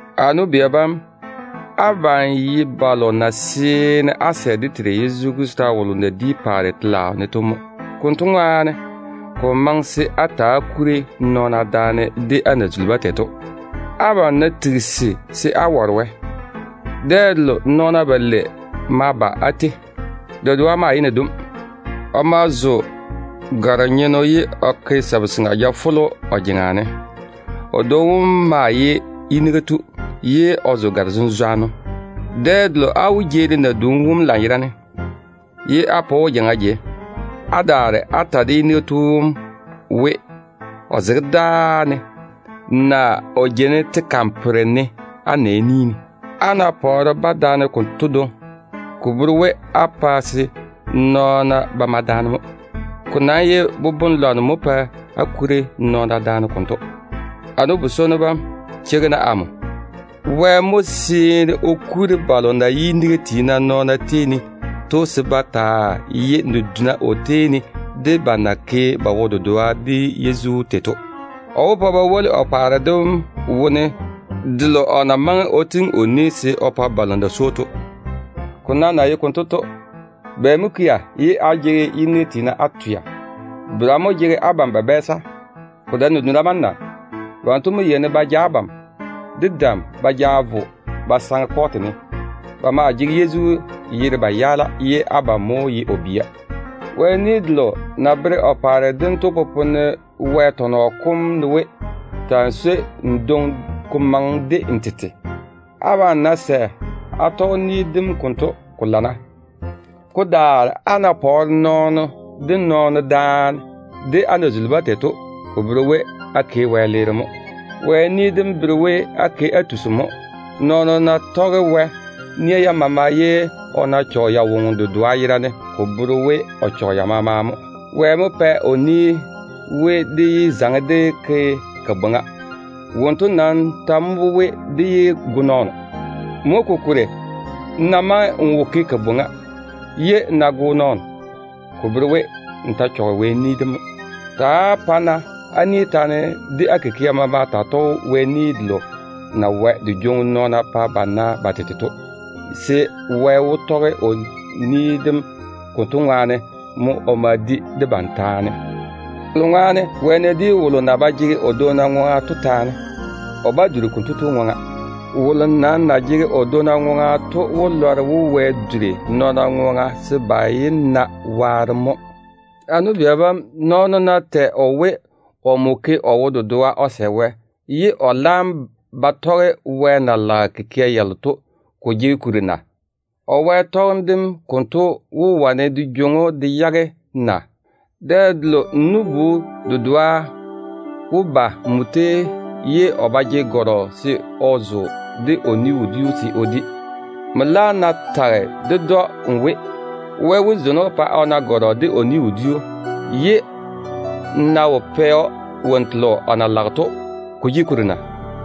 A nu-bia bam, abam ye balo na seene á sɛ dé Teiru Yezu Krista wolo na di paare telaao ne to mo. Konto ŋwaane, ko wo maŋe se á ta‑á kuri nɔɔna daane de á na zuli-ba tei to. Abam ná tigisi daane se á ware Wɛ, dɛ delo nɔɔna balei ma ba á tei. Dedoa maa ye nadum. O ma zo gare-nyenno ye o ke sabu-seŋa jafolo o jeŋa ne. O dwoŋi wom maa ye yiniga tu, ye o zo gare-zenzwanno. Dɛ delo á wó jeeri nadum wom lanyerane, ye á pa o na jeiŋa jei, á daare á ta de yiniga tu wom we, o zege dáa ne, naa o jeini tega ne á nɛ ni ne. Á ná pɔɔre-ba daane konto dwoŋi, ko bere we á pae se nɔɔna ba mae daane mo. Ko nam ye boboŋ-lwanno mo pae á kuri nɔɔna daane konto. A nu-bi-swonnu bam, cheigi-na amo. Wɛ mo seene o kuri balo na ye yiniga tiina nɔɔna tei ne to, se ba taa ye naduna o tei ne, de ba na ke ba wo-dedoa de Yezu tei to. O wó pa ba woli o paare dem wone, ne o na maŋe o pwooli se o ke o pa balo na swoi‑o to. Ko nam na ye konto to, bɛ mo kea ye á jege yiniga tiina á twea? Bera mo jege abam ba bɛɛsa? Ko dae naduna bam mo na? Banto mo yeini ba ja abam de dam ba ja vo ba saŋe kɔɔte ne. Ba maa jege Yezu yere-ŋom dem ba twea, ye abam mo ye o bia. Wɛ ni delo na bere o paare dem to popone Wɛ tɔnɔ kom ne we, “Ta‑n swoi n dwoŋi se ko maŋe de n na swoi n tete tei to.” Abam ná sɛ á tɔge ni dem konto, ko lana. Ko daare á ná pɔɔre nɔɔno de nɔɔno daane de á na zuli-ba tei to, ko bere we á ke wɛleere mo. Wɛ ni dem bere we á ke á tusi mo. Nɔɔno ná tɔge Wɛ nia yam maama ye o ná chɔge ya woŋo dedoa yerane, ko bere we o chɔge ya maama mo. Wɛ mo pɛ o ni we, dé yé zaŋe dé ke kabwoŋa. Wonto nam ta mo we, dé yé go nɔɔno. Mo kokuri, n ná maŋe n wo ke kabwoŋa, ye n ná go nɔɔno, ko bere we, n ta chɔge Wɛ ni mo. Ta‑á pa-na á ni taane de á kikia maama taa tɔge Wɛ ni delo na wae de jwoŋi nɔɔna pa ba na ba tete to, se Wɛ wó tɔge o ni dem konto baŋa ne mo o ma di debam taane. Kolo ŋwaane, Wɛ ná di wolo na ba jege o dwonna ŋwaŋa to taane, o bá duri konto tu de ŋwaŋa. Wolo nam na jege o dwonna ŋwaŋa to wó lɔre we, Wɛ duri nɔɔna ŋwaŋa se ba yé na waarem mo. A nu-bia bam, nɔɔno ná tɛ o we, omo ke o wo-dedoa de Wɛ, ye o laam ba tɔge kikia yalo na maŋe to, ko jege kuri na? O Wɛ chwoŋa tɔgem dem konto wó wane de jwoŋi‑o de yage na? Dɛ delo n nu-bu dedoa wó ba nmo tei ye o ba jege gɔrɔ se o zo, de o ni-wodiu se o di. Nmo laam ná tage ded‑o n we, o véi, se Wɛ wó zeini‑o pa o na gɔrɔ de o ni-wodiu, ye n ná wo pɛ‑o wonnu telo o na lage to, ko jege kuri na?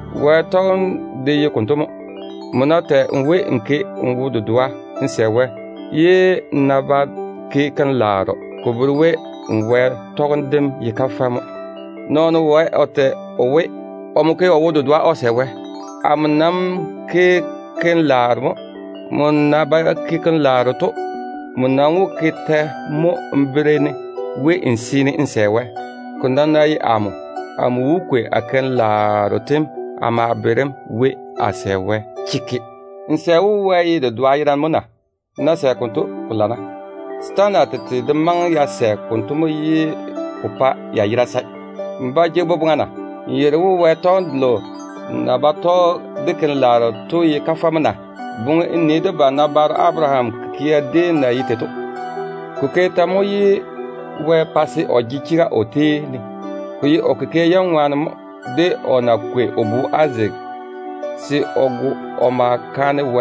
Wɛ chwoŋa tɔgem de ye konto mo. Nmo ná tɛ we, n ke n wo-dedoa de Wɛ, ye n laam daare n ba ke keim-laaro, ko bere we n Wɛ chwoŋa tɔgem dem ye kafɛ mo. Nɔɔno wae o tɛ we, omo ke o wo-dedoa de Wɛ. Amo nam ke keim-laaro mo. Nmo na ba ke keim-laaro to, nmo nam wó ke tɛ mo n bere-ne we n seene n ke n wo-dedoa de Wɛ? Ko nam ná ye amo, amo wó kwei a keim-laaro tem a ma bere‑m we a sɛ Wɛ de wo-dedoa. N sɛ we Wɛ ye dedoa yerane mo na? N ná sɛ konto, ko lana. Setaana tete de maŋe ya sɛ konto mo, ye ko pae ya yera sae. N ba jege boboŋa mo na? N yeiri we Wɛ chwoŋa tɔgem delo na ba tɔge de keim-laaro to ye kafɛ mo na? Boŋe n nii debam nabaaro Abaraham kikia déem na ye tei to. Ko ke tɛ mo ye Wɛ pa se o jege chega o tei ne? Ko ye o kikia yam ŋwaane mo, de o na kwei o bu Izaak se o go o ma ke kaanem.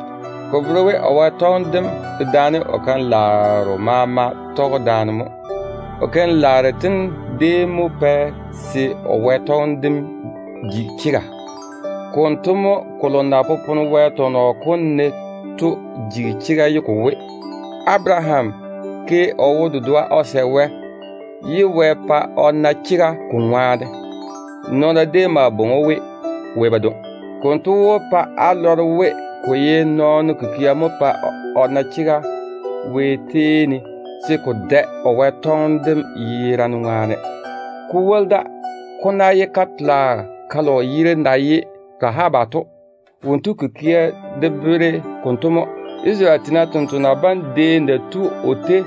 Ko bere we o Wɛ chwoŋa tɔgem dem dedaane o keim-laaro maama tɔge daane mo. O keim-laaro tem déem mo pɛ se o Wɛ chwoŋa tɔgem dem ji chega. Konto mo, kolo na popone Wɛ tɔnɔ kom ne to jigi chega ye ko we, “Abaraham ke o wo-dedoa de Wɛ, ye Wɛ pa o na chega ko ŋwaane.” Nɔɔna déem maa bwoi‑o we “Wɛ badwoŋi”. Konto wó pa á lɔre we, ko ye nɔɔno kikia mo pae o na chega Wɛ tei ne, se ko dae o na ke o wo-dedoa de Wɛ to yerane ŋwaane. Ko woli da, ko ná ye ka-tola kalo yere na ye Rahaba to, wonto kikia de bere konto mo. Isarele tiina tontoŋena bam déem na tu o tei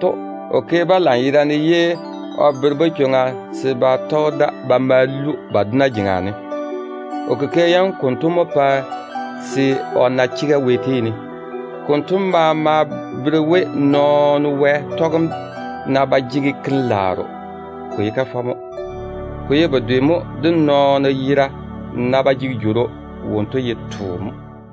to, o ke-ba lanyerane ye o bere-ba chwoŋa se ba tɔge da ba ma lu ba dona jeŋa ne. O kikia yam konto mo pɛ se o na chega Wɛ tei ne. Konto maama bere we, nɔɔno Wɛ chwoŋa tɔgem ná ba jege keim-laaro, ko ye kafɛ mo. Ko ye bedwe mo de nɔɔno yera ná ba jege jworo, wonto ye too mo.